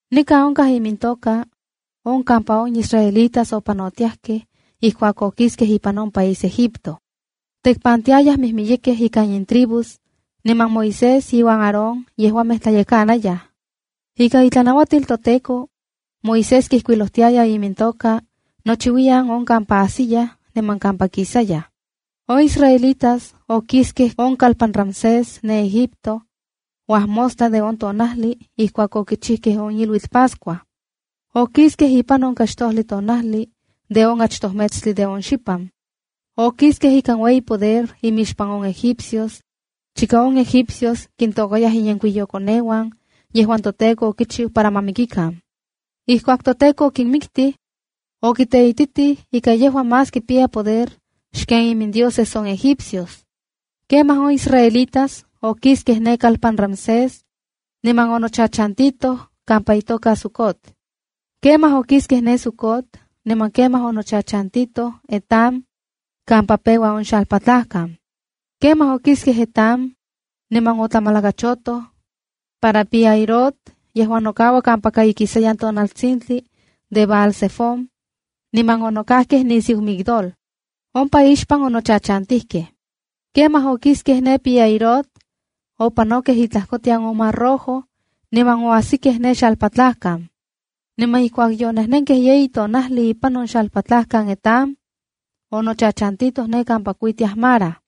Nikan onkaj imintoka on kampaka on israelitas opanotiajkej ijkuak okiskej ipan on país Egipto. Tekpantiayaj mijmiyekej ikan intribus, niman Moisés iuan Aarón yejuamej tlayekanayaj. Ika itlanauatil toTEKO, Moisés kijkuilojtiaya imintoka nochiuiyan on kampa ajsiyaj niman kampa kisayaj. On israelitas okiskej on kalpan Ramsés ne Egipto, uajmostla de on tonajli ijkuak yokichijkej on iluitl Pascua. Okiskej ipan on kaxtojli tonajlia de on achtoj metstli de on xipan. Okiskej ikan ueyi poder imixpan on Egipcios, chika on egipcios kintôkayaj inyenkuiyokoneuan yejuan toTEKO okichiu para ma mikikan. Ijkuak toTEKO okinmiktij, okiteititij ika yejua más kipiya poder xken imindioses on egipcios. Kemaj on israelitas okiskej ne kalpan Ramsés niman onochachantitoj kampa itoka Sucot. Kemaj okiskej ne Sucot niman kemaj onochachantitoj Etam kampa peua on xalpatlajkan. Kemaj okiskej Etam niman otlamalakachotoj para Pi-hahirot yejuan nokaua kampaka ikisayan tonaltsintli de Baal-zefón, niman onokajkej nisiu Migdol. Ompa ixpan ochachantijkej. Kemaj okiskej ne Pi-hahirot, opanokej itlajkotian on Mar Rojo, niman oajsikej ne xalpatlajkan. Niman ijkuak yonejnenkej yeyi tonajli ipan on xalpatlajkan Etam, onochachantitoj ne kampa kuitiaj Mara.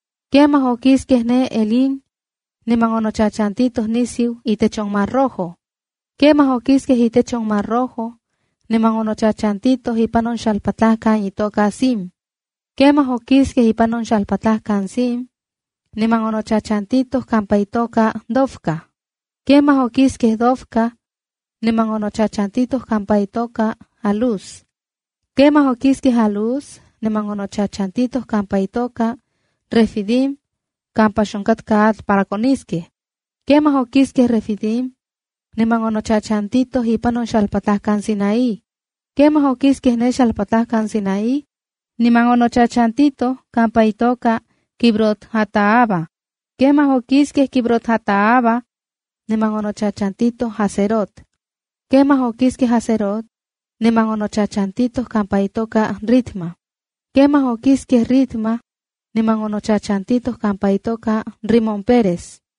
Kemaj okiskej ne Elim niman onochachantitoj nisiu itech on Mar Rojo. Kemaj okiskej itech on Mar Rojo, niman onochachantitoj ipan on xalpatlajkan itoka Sin. Kemaj okiskej ipan on xalpatlajkan Sin, niman onochachantitoj kampa itoka Dofca. Kemaj okiskej Dofca, niman onochachantitoj kampa itoka Alús. Kemaj okiskej Alús, niman onochachantitoj kampa itoka Refidim kampa xonkatka atl para koniskej. Kemaj okiskej Refidim, niman onochachantitoj ipan on xalpatlajkan Sinaí. Kemaj okiskej ne xalpatlajkan Sinaí, niman onochachantitoj kampa itoka Kibrot-hataava. Kemaj okiskej Kibrot-hataava niman onochachantitoj Hazerot. Kemaj okiskej Hazerot, niman onochachantitoj kampa itoka Ritma. Kemaj okiskej Ritma, niman onochachantitoj kampa itoka Rimón-peres.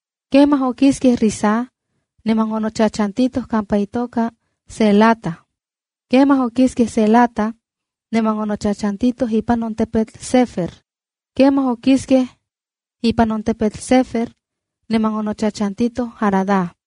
Kemaj okiskej Rissa, niman onochachantitoj kampa itoka Ceelata. Kemaj okiskej Ceelata, niman onochachantitoj ipan on tepetl Sefer. Kemaj okiskej ipan on tepetl Sefer, niman onochachantitoj kampa itoka Harada.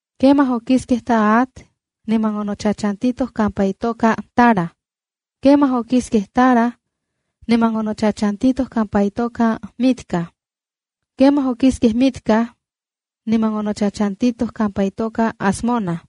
Kemaj okiskej Tahat, niman onochachantitoj kampa itoka Tara. Kemaj okiskej Tara, niman onochachantitoj kampa itoka Mitca. Kemaj okiskej Mitca, niman onochachantitoj kampa itoka Hasmona.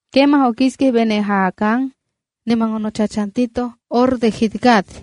Kemaj okiskej Bene-jaacán, niman onochachantitoj kampa itoka Hor de Gidgad.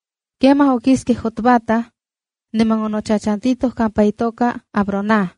Kemaj okiskej Jotbata, niman onochachantitoj kampa itoka Abrona.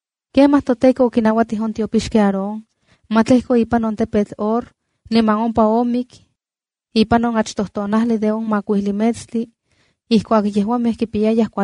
Kemaj toTEKO okinauatij on tiopixki Aarón, ma tlejko ipan on tepetl Hor niman ompa omik ipan on achtoj tonajli de on makuijli metstlib, ijkuak yejuamej kipiyayaj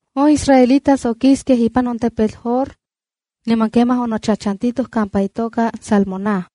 On israelitas okiskej ipan on tepetl Hor, niman kemaj onochachantitoj kampa itoka Zalmona.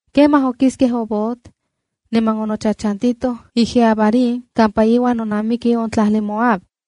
Kemaj okiskej Obot, niman onochachantitoj Ije-abarim kampa iuan nonamiki on tlajli Moab.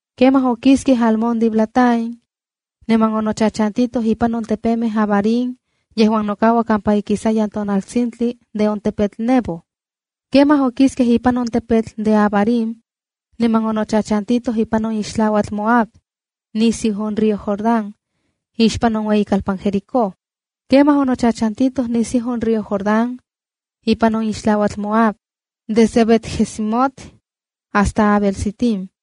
Kemaj okiskej Almón-diblataim, niman onochachantitoj ipan on tepemej Abarim yejuan nokaua kampaka ikisayan tonaltsintli de on tepetl Nebo. Kemaj okiskej ipan on tepemej Abarim, niman onochachantitoj ipan on ixtlauatl de Moab nisiu on río Jordán, ixpan on ueyikalpan Jericó. Kemaj onochachantitoj nisiu on río Jordán ipan on ixtlauatl Moab, desde Bet-jesimot hasta Abel-sitim.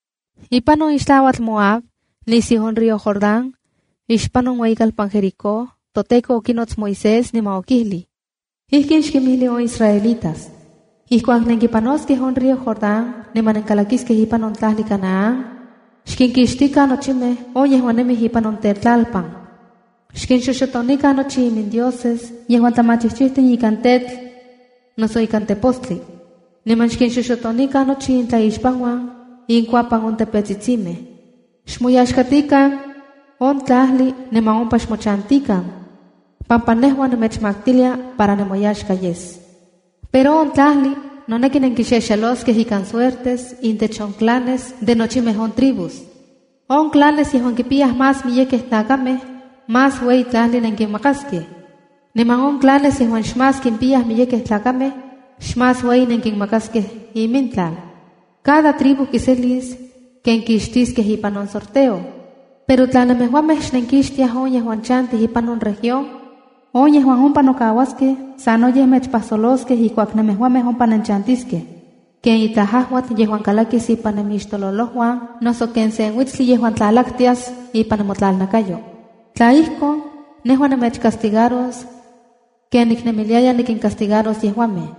Ipan on ixtlauatl Moab nisiu on río Jordán, ixpan on ueyikalpan Jericó, toTEKO okinots Moisés, niman okijlij: “Ijkin xkinmijli on israelitas: Ijkuak nenkipanoskej on río Jordán niman nenkalakiskej ipan on tlajli Canaán, xkinkixtikan nochimej on yejuan nemij ipan on tetlalpan. Xkinxoxotonikan nochi imindioses yejuan tlamachijchijtin ikan tetl, noso ikan tepostli. Niman xkinxoxotonikan nochi intlaixpanuan inkuapan on tepetsitsimej. Xmoyaxkatikan on tlajli niman ompa xmochantikan, pampa nejua nemechmaktilia para nemoyaxka yes. Pero on tlajli noneki nenkixexeloskej ikan suertes intech on clanes de nochimej on tribus. On clanes yejuan kimpiyaj más miyekej tlakamej, más ueyi tlajli nenkinmakaskej, niman on clanes yejuan xmás kimpiyaj miyekej tlakamej, xmás ueyi nenkinmakaskej imintlal. Cada tribu kiselis ken kixtiskej ipan on sorteo. “Pero tla nemejuamej xnenkinkixtiaj on yejuan chantij ipan on región, on yejuan ompa nokauaskej sanoyej mechpajsoloskej ijkuak nemejuamej ompa nenchantiskej, ken itlaj ajuatl yejuan kalakis ipan nemixtololojuan noso ken sen uitstli yejuan tlalaktias ipan nemotlalnakayo. Tla ijkon, nejua nemechcastigaros ken niknemiliaya nikincastigaros yejuamej.”